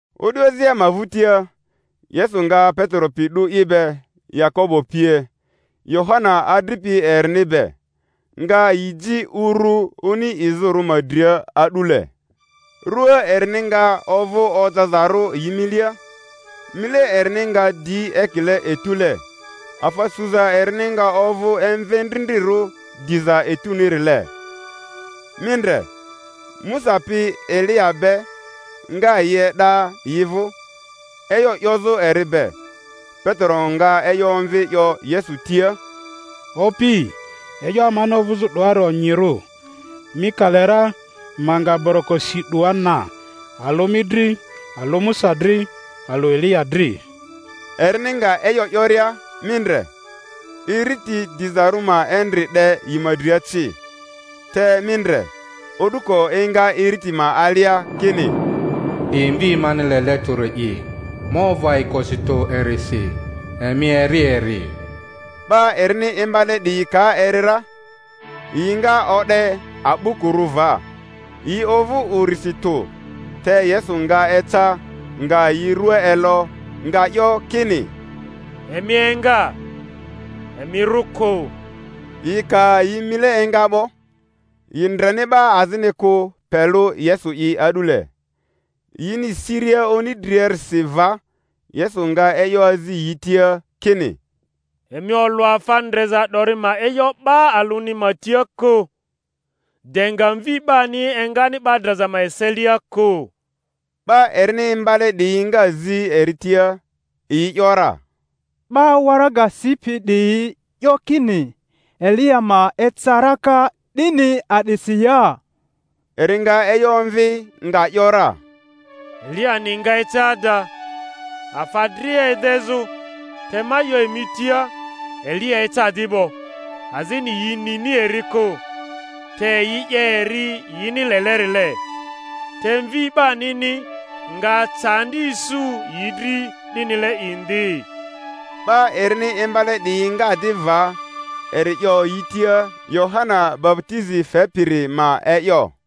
O'du azia ma vᴜtia, Yesu nga Petero pi 'du i be, Yakobo pie, Yohana adripi erini be, nga yi ji uru oni izᴜrᴜ ma dria a'dule. Rua erini nga ovᴜ ojazarᴜ yi milia, mile erini nga di ekile etule, afa suza erini nga ovᴜ emvendrindrirᴜ diza etunile. Mi ndre, Musa pi Eliya be nga yi e'da yi vᴜ, e'yo 'yozᴜ eri be. Petero nga e'yo omvi 'yo Yesu tia, Opi, e'yo amani ovᴜzᴜ 'doari onyirᴜ; mi ka le ra, ma nga boroko si 'doa na, alᴜ mi dri, alᴜ Musa dri, alᴜ Eliya dri. Erini nga e'yo 'yoria, mi ndre, iriti dizarᴜ ma endri 'de yi ma dria ci, te mi ndre, o'duko enga iriti ma alia kini, 'Di Mvi mani lele tᴜri'i, ma ovᴜ ayikosi tᴜ erisi; emi eri eri. 'Ba erini imbale 'diyi ka eri ra, yi nga o'de a'bukurᴜ va, yi ovᴜ urisi tᴜ. Te Yesu nga eca, nga yi rua elo, nga 'yo kini, Emi enga, emi rᴜ kᴜ. Yi ka yi mile enga 'bo, yi ndreni 'ba azini kᴜ, pe lᴜ Yesu'i a'dule. Yini siria oni driarisi va, Yesu nga e'yo azi yi tia kini, Emi olᴜ afa ndreza 'dori ma e'yo 'ba alᴜni ma tia kᴜ, de nga Mvi 'bani engani 'ba draza ma eselia kᴜ. 'Ba erini imbale 'diyi nga zi eri tia, yi ‘yora, 'Ba waraga sipi 'diyi 'yo kini Eliya ma eca raka, 'dini a'disi ya? Eri nga e'yo omvi, nga ‘yora, Eliyani nga eca ada, afa dria edezᴜ; te ma 'yo emi tia, Eliya eca di 'bo, azini yi nini eri kᴜ, te yi 'ye eri yini lelerile. Te Mvi 'banini nga candi isu yi dri 'dinile indi. 'Ba erini imbale 'diyi nga di va eri 'yo yi tia Yohana baputizi fepiri ma e'yo.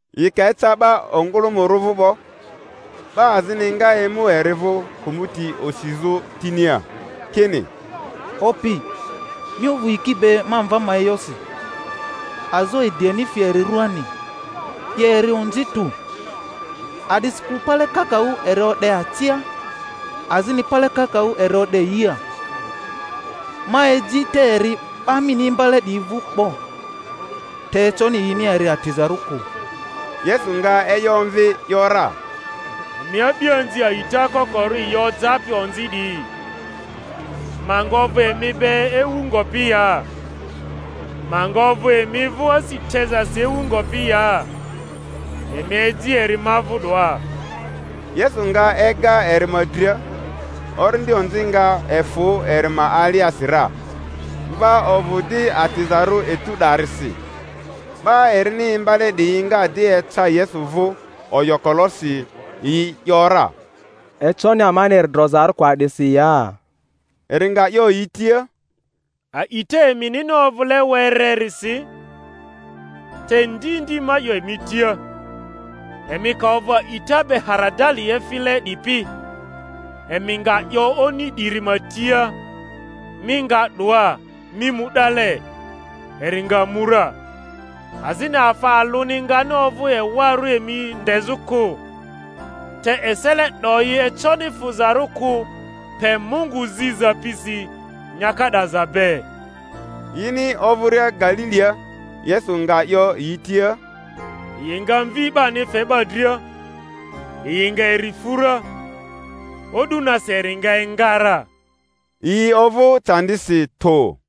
Yi ka eca 'ba ongᴜlᴜmᴜrᴜ vᴜ 'bo, 'ba azini nga emu eri vᴜ, kᴜmᴜti osizᴜ tinia, kini, Opi, mi ovᴜ yiki be ma mva ma e'yosi, azo ediani fi eri rᴜaani, 'ye eri onzi tᴜ; a'disikᴜ pale kakaᴜ eri o'de acia, azini pale kakaᴜ eri o'de yia. Ma eji te eri 'ba mini imbale 'diyi vᴜ 'bo, te econi yini eri atizarᴜ kᴜ. Yesu nga e'yo omvi, ‘yora, Emi a'bianzi a'ita kokorᴜ yi ojapi onzi 'diyi, ma nga ovᴜ emi be ewu ngopi ya? Ma nga ovᴜ emi vᴜ asi tezasi ewu ngopi ya? Emi eji eri ma vᴜ 'doa. Yesu nga ega eri ma dria; orindi onzi nga efᴜ eri ma aliasi ra, mva ovᴜ di atizarᴜ etu 'darisi. 'Ba erini imbale 'diyi nga di eca Yesu vᴜ oyokolosi, yi ‘yora, Econi amani eri drozarᴜ kᴜ a'disi ya? Eri nga 'yo yi tia, A'ita eminini ovᴜle wererisi. Te ndi ndi ma 'yo emi tia, emi ka ovᴜ a'ita be haradali efile 'dipi, emi nga 'yo oni 'diri ma tia, Mi nga 'doa, mi mu 'dale, eri nga mu ra; azini afa alᴜni ngani ovᴜ ewarᴜ emi ndezᴜ kᴜ. Te esele 'doyi econi fᴜzarᴜ kᴜ pe Mungu ziza pisi nyaka 'daza be. Yini ovᴜria Galilia, Yesu nga 'yo yi tia, Yi nga Mvi 'bani fe 'ba dria, yi nga eri fu ra, o'du nasi eri nga enga ra. Yi ovᴜ candisi tᴜ.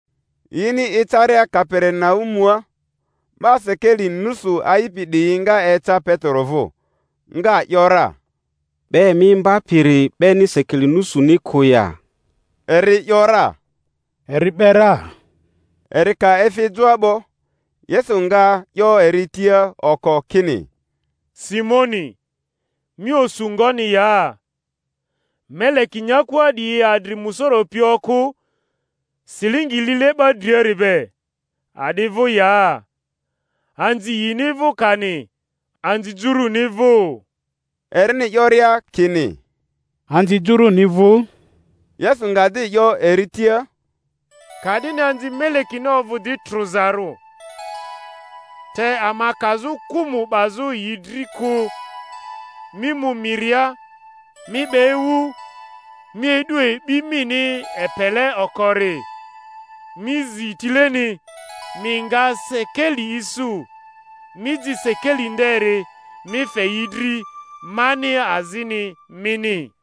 Yini ecaria Kaperinaumua, 'ba sekeli nusu a'ipi 'diyi nga eca Petero vᴜ, nga ‘yora, 'Ba emi imbapiri 'beni sekeli nusuni kᴜ ya? Eri ‘yora, Eri 'be ra. Eri ka efi joa 'bo, Yesu nga 'yo eri tia oko, kini, Simoni, mi osu ngoni ya? Meleki nyakua 'diyi adri musoro pi okᴜ, silingi lile 'ba driari be, a'di vᴜ ya? Anzi yini vᴜ kani anzi jurᴜni vᴜ? Erini 'yoria kini, Anzi juruni vᴜ, Yesu nga di 'yo eri tia, Ka'dini anzi melekini ovᴜ di trᴜzarᴜ. Te ama kazᴜ kᴜmᴜ 'bazᴜ yi dri kᴜ, mi mu miria, mi 'be ewu, mi e'du e'bi mini epele okori, mi zi tileni, mi nga sekeli isu; mi ji sekeli nderi, mi fe yi dri, mani azini mini.